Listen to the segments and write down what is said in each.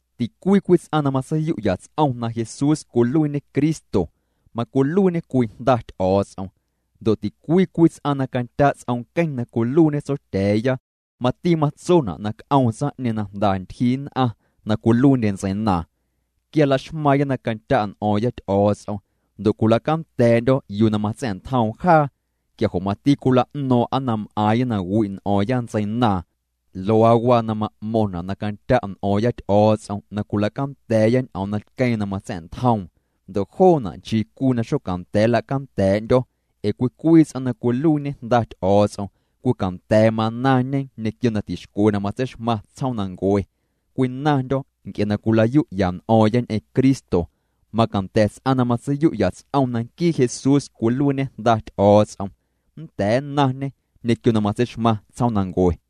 Ticwii cwii ts'aⁿ na matseiyu'ya ts'om na Jesús cwiluiiñe Cristo, macwiluiiñê cwii jnda Ty'o̱o̱ts'om. Ndo' ticwii cwii ts'aⁿ na candya' ts'om nqueⁿ na cwiluiiñê Tsotya̱a̱ya, mati matsona' na c'oom tsaⁿ'ñeeⁿ na jnda ntyjii nn'aⁿ na cwiluiindye ntseinaaⁿ. Quia laxmaaⁿya na candya' n'o̱o̱ⁿya Ty'o̱o̱ts'om ndo' cwila'canda̱a̱'ndyo̱ yuu na matsa̱'ntjoom jaa, quia jo' mati cwila'no̱o̱ⁿ'a na m'aaⁿya na wi' n'o̱o̱ⁿya ntseinaaⁿ. Luaa waa na ma'mo̱ⁿna' na candya' n'o̱o̱ⁿya Ty'o̱o̱ts'om na cwila'canda̱a̱ya ñ'oom na tqueeⁿ na matsa̱'ntjoom, ndo' joona' nchii cwii na xocanda̱a̱ nla'canda̱a̱'ndyo̱, ee cwii cwii ts'aⁿ na cwiluiiñe jnda Ty'o̱o̱ts'om cwii canda̱a̱ manaⁿñe ñequio na tixcwe na matseixmaⁿ tsjoomnancue. Cwinaⁿndyo̱ nc'e na cwila'yu'ya n'o̱o̱ⁿya ñ'eⁿ Cristo. Macanda̱ ts'aⁿ na matseiyu'ya ts'om na nquii Jesús cwiluiiñe Jnda Ty'o̱o̱ts'om nnda̱a̱ nnaⁿñê ñequio na matseixmaⁿ tsjoomnancue.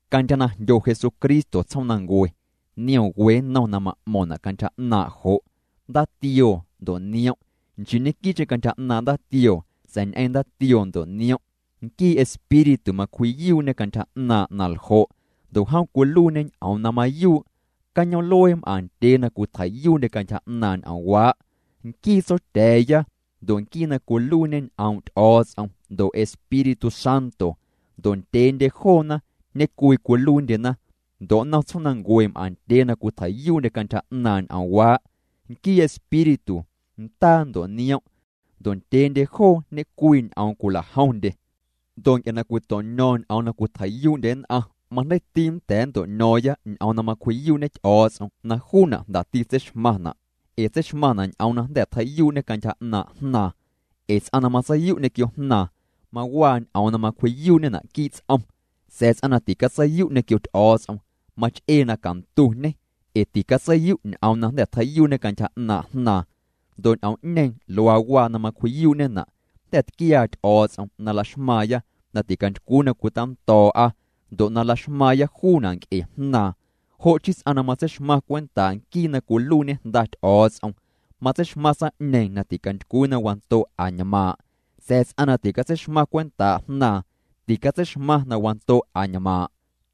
Cantyja na jndyo Jesucristo tsjoomnancue, niom we nnom na ma'mo̱ⁿna' cantyja 'naaⁿ' jo', ndaatioo ndo' niom', nchii ñequii'cheⁿ cantyja 'naaⁿ' ndaatioo sa̱a̱ ñ'eⁿ ndaatioo ndo' niom'. Nquii Espíritu macwji'yuu'ñe cantyja 'naaⁿ' na ljo' ndo' jom cwiluiiñê ñ'oom na mayuu'. Cañoom'luee m'aⁿ ndyee na cwitjei'yuu'ndye cantyja 'naaⁿ' ñ'oomwaa': Nquii Tsotya̱a̱ya, ndo' Nquii na cwiluiiñe ñ'oom' Ty'o̱o̱ts'om ndo' Espíritu Santo. Ndo' ndyeendye joona ñecwii cwiluiindyena. Ndo' nnom tsjoomnancue m'aⁿ ndyee na cwitjei'yuu'ndye cantyja 'naaⁿ' ñ'oomwaa': Nquii Espíritu, ndaa ndo' niom', ndo' ndyeendye joo ñecwii ñ'oom cwilajomndye. Ndo' nc'e na cwito'ño̱o̱ⁿya ñ'oom na cwitjei'yuu'ndye nn'aⁿ, majndeiiti nnda̱a̱ nnto'ño̱o̱ⁿya ñ'oom na macwji'yuu'ñe Ty'o̱o̱ts'om na juuna' jndati tseixmaⁿna', ee tseixmaⁿna' ñ'oom na jnda̱ tjei'yuu'ñê cantyja 'naaⁿ' Jnaaⁿ. Ee ts'aⁿ na matseiyu' ñequio Jnaaⁿ, mawaa ñ'oom na macwji'yuu'ñena' quii' ts'om, sa̱a̱ ts'aⁿ na ticatseiyu' ñequio Ty'o̱o̱ts'om mach'ee na cantuñê ee ticatseiyu' ñ'oom na jnda̱ tjei'yuu'ñê cantyja 'naaⁿ' Jnaaⁿ. Ndo' ñ'oom'ñeeⁿ, luaa waa na macwji'yuu'ñena', jnda̱ tquiaa Ty'o̱o̱ts'om na laxmaaⁿya na ticantycwii na cwitando̱o̱'a, ndo' na laxmaaⁿya juuna' nc'e Jnaaⁿ. Jo' chii ts'aⁿ na matseixmaⁿ cwentaa' nquii na cwiluiiñe Jnda Ty'o̱o̱ts'om matseixmaⁿ tsaⁿ'ñeeⁿ na ticantycwii na wando' añmaaⁿ', sa̱a̱ ts'aⁿ na ticatseixmaⁿ cwentaa' Jnaaⁿ, ticatseixmaⁿ na wando' añmaaⁿ'.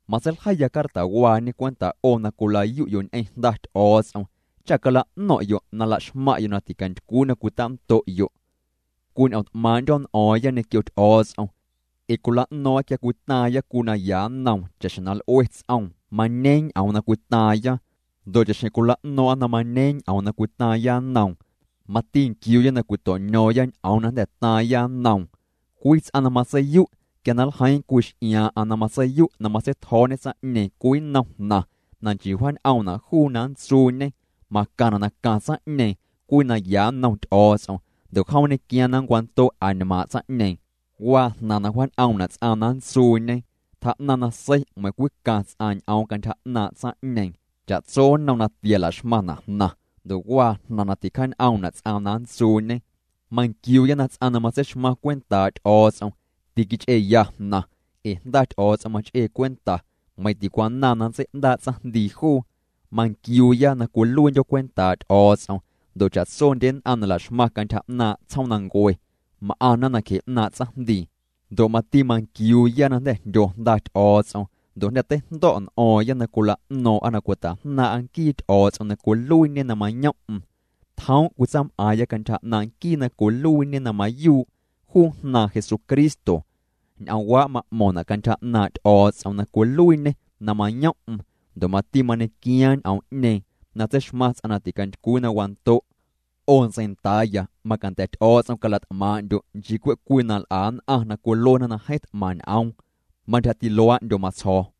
Matseiljeiya cartawaañe cwenta' 'o na cwilayu'yo' ñ'eⁿ Jnda Ty'o̱o̱ts'om cha cala'no̱ⁿ'yo' na laxmaⁿ'yo' na ticantycwii na cwitando'yo'. Cwiñ'o̱o̱ⁿt'maaⁿ'ndyo̱ n'o̱o̱ⁿya Ty'o̱o̱ts'om ee cwila'no̱o̱ⁿ'a quia cwitaaⁿya cwii naya nnoom cha'xjeⁿ na l'ue ts'oom, mañeeⁿ ñ'oom na cwitaaⁿya. Ndo' cha'xjeⁿ cwila'no̱o̱ⁿ'a na mañeeⁿ ñ'oom na cwitaaⁿya nnoom, mati nquiuuya na cwito'ño̱o̱ⁿya ñ'oom na jnda̱ taaⁿya nnoom. Cwii ts'aⁿ na matseiyu', quia nljeii cwii x'iaa' na matseiyu' na matseitjo̱o̱ñe tsaⁿ'ñeeⁿ cwii nnom jnaⁿ na nchii wjaañ'oomna' juu na nntsuuñe, macaⁿna' na caⁿ tsaⁿ'ñeeⁿ cwii naya nnom Ty'o̱o̱ts'om ndo' jom nñequiaaⁿ na nncwando' añmaaⁿ' tsaⁿ'ñeeⁿ. Waa jnaⁿ na wjaañ'oomna' ts'aⁿ na nntsuuñe, tjaa'naⁿ nasei meiⁿ cwii caⁿ ts'aⁿ ñ'oom cantyja 'naaⁿ' tsaⁿ'ñeeⁿ. Cha'tso nnom natia, laxmaⁿna' jnaⁿ ndo' waa jnaⁿ na ticjaañ'oomna' ts'aⁿ na nntsuuñe. Manquiuuya na ts'aⁿ na matseixmaⁿ cwentaa' Ty'o̱o̱ts'om tiquich'eeya jnaⁿ ee Jnda Ty'o̱o̱ts'om mach'ee cwenta, meiⁿ ticwanaaⁿ na ntsei'ndaa' tsaⁿjndii juu. Manquiuuya na cwiluiindyo̱ cwentaa' Ty'o̱o̱ts'om ndo' cha'tsondye nn'aⁿ na laxmaⁿna cantyja 'naaⁿ' tsjoomnancue m'aⁿna nacje 'naaⁿ' tsaⁿjndii. Ndo' mati manquiuuya na jnda̱ jndyo Jnda Ty'o̱o̱ts'om ndo' jnda̱ teijndo̱' n'o̱o̱ⁿya na cwila'no̱o̱ⁿ'a na cwitajnaaⁿ'a nquii Ty'o̱o̱ts'om na cwiluiiñê na mayom'm. Tjoom' cwitsaam'aaⁿya cantyja 'naaⁿ' nquii na cwiluiiñe na mayuu', juu Jnaaⁿ Jesucristo. Ñ'oomwaa' ma'mo̱ⁿna' cantyja 'naaⁿ' Ty'o̱o̱ts'om na cwiluiiñê na mayom'm ndo' mati mañequiaa ñ'oom'ñeeⁿ na tseixmaⁿ ts'aⁿ na ticantycwii na wando'. 'O ntseindaaya, macanda̱ Ty'o̱o̱ts'om cala't'maaⁿ'ndyo', nchii cwe' cwii na l'a nn'aⁿ na cwiluena na jeeⁿ t'maⁿ ñ'oom. Mantyjati luaa'ndyo matsjo̱o̱.